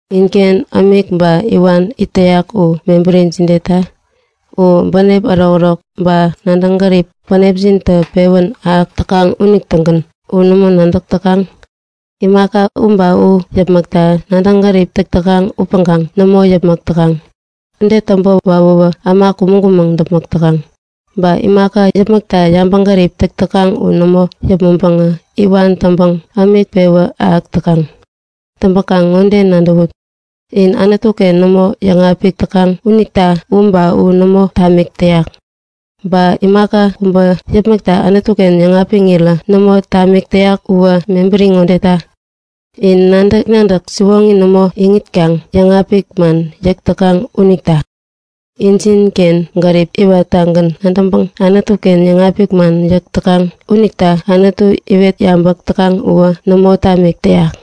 Inken ämik ba iwan it täyak u mebäri jideta? U bänep ärokärok ba nadäŋ gärip bänepjintä pewän ahäk täkaŋ unitägän. U nämo nadäk täkaŋ? Imaka u ba u yäpmäkta nadäŋ gärip täk täkaŋ upäŋkaŋ nämo yäpmäk täkaŋ. Ude täŋpä wawäwä äma kumäŋ-kumäŋ däpmäk täkaŋ. Ba imaka yäpmäkta yabäŋgärip täk täkaŋ u nämo yäpmäŋpäŋä iwan täŋpäŋ ämik pewä ahäk täkaŋ. Täŋpäkaŋ ŋode nadäwut; In Anutu-ken nämo yäŋapik täkaŋ unita u ba u nämo tamik täyak. Ba imaka kubä yäpmäkta Anutu-ken yäŋapiŋirä nämo tamik täyak uwä mebäri ŋodeta; In nadäk-nadäk siwoŋi nämo iŋitkaŋ yäŋapik man yäk täkaŋ unita. Injinken gärip iwattagän nadäŋpäŋ Anutu-ken yäŋapik man yäk täkaŋ unita Anutu iwet yabäk täkaŋ uwä nämo tamik täyak.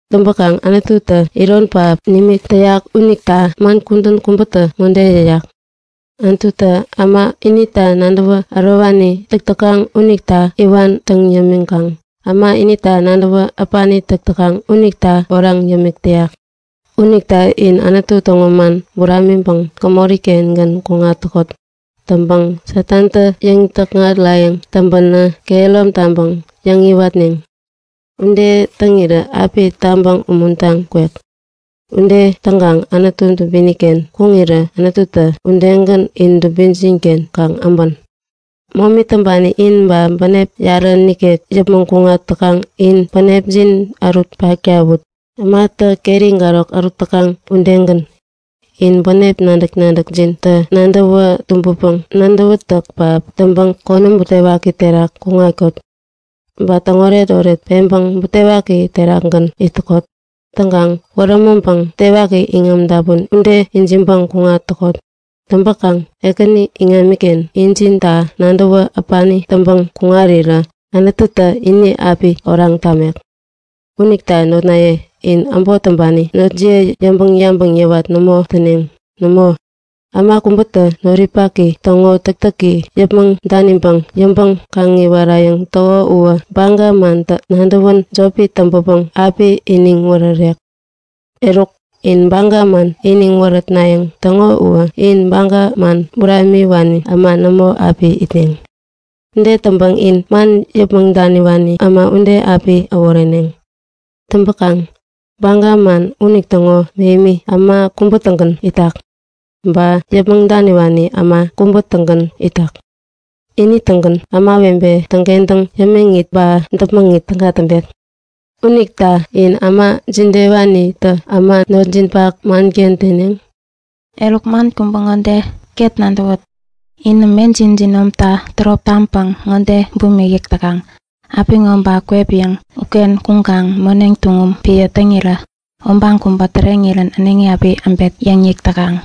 Täŋpäkaŋ Anututä iron pähap nimik täyak. Unita man kudän kubätä ŋode yäyak; Anututä äma inita nadäwä ärowani täk täkaŋ unita iwan täŋ yämiŋkaŋ äma inita nadäwä äpani täk täkaŋ unita oraŋ yämik täyak. Unita in Anutu täŋo man buramiŋpäŋ gämori-kengän kuŋat täkot. Täŋpäŋ Satantä yäŋ-täkŋarayäŋ täŋpänä kehärom taŋpäŋ yäŋiwatneŋ. Ude täŋirä api tabäŋ umuntaŋ kwek. Ude täŋkaŋ Anutu dubini-ken kuŋirä Anututä udegän in dubinjin-ken kaŋ äbän. Momi täŋpani in, ba bänep yarä nikek yäpmäŋ kuŋat täkaŋ in bänepjin ärut paktawut, ämatä keri garok ärut täkaŋ udegän. In bänep nadäk-nadäkjinta nadäwä tumbäpäŋ nadäwätäk pähap täŋpäŋ konäm butewaki terak kuŋatkot. Ba täŋoret-oret peŋpäŋ butewaki terakgän it täkot. Täŋkaŋ wärämäŋpäŋ butewaki iŋam dapun ude ijiŋpäŋ kuŋat täkot. Täŋpäkaŋ Ekäni iŋamiken injinta nadäwä äpani täŋpäŋ kuŋarirä Anututä ini wäp biŋam api tamek. Unita notnaye, in äbot täŋpani notjiye yäŋpäŋ-yabäŋ yawat nämo täneŋ. Nämo, äma kubätä noripaki täŋo täktäki yäpmäŋ daniŋpäŋ yäŋpäŋ-kaŋiwarayäŋ täko uwä baga manta nadäwän jopi täŋpäpäŋ api iniŋ wärärek. Eruk, in baga man iniŋ wärätnayäŋ täŋo uwä in baga man buramiwani äma nämo api itneŋ. Nämo, in man yäpmäŋ daniwani äma ude api äworeneŋ. Täŋpäkaŋ baga man unitäŋo mähemi, äma kubä-tägän itak. Ba yäpmäŋ daniwani äma kubä-tägän itak. Ini-tägän ämawebe täŋkentäŋ yämiŋit ba däpmäŋit täga täŋpek. Unita in äma jidewanitä äma notjinpak manken teneŋ? Eruk, man kubä ŋo ket nadäwut; Inä mejin jinomtä tärop taŋpäŋ ŋode bumik yäk täkaŋ; Apiŋo ba kwep kome uken kuŋkaŋ moneŋ tuŋum piä täŋira obaŋ kubä täreŋirän äneŋi api äbet yäŋ yäk täkaŋ.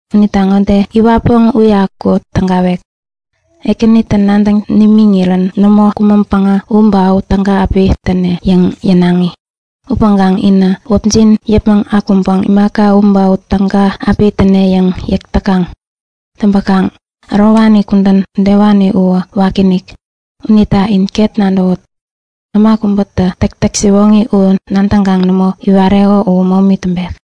Unita ŋode yäwäpäŋ uyaku tägatek; Ekänitä nadäŋ nimiŋirän nämo kumäŋpäŋä u ba u täga api täne yäŋ yänaŋi. Upäŋkaŋ inä wäpjin yäpmäŋ akuŋpäŋ imaka u ba u täga api täne yäŋ yäk täkaŋ. Täŋpäkaŋ ärowani kudän udewani uwä wakiinik. Unita in ket nadäwut. Äma kubätä täktäk siwoŋi u nadäŋkaŋ nämo iwareko u momi täŋpek.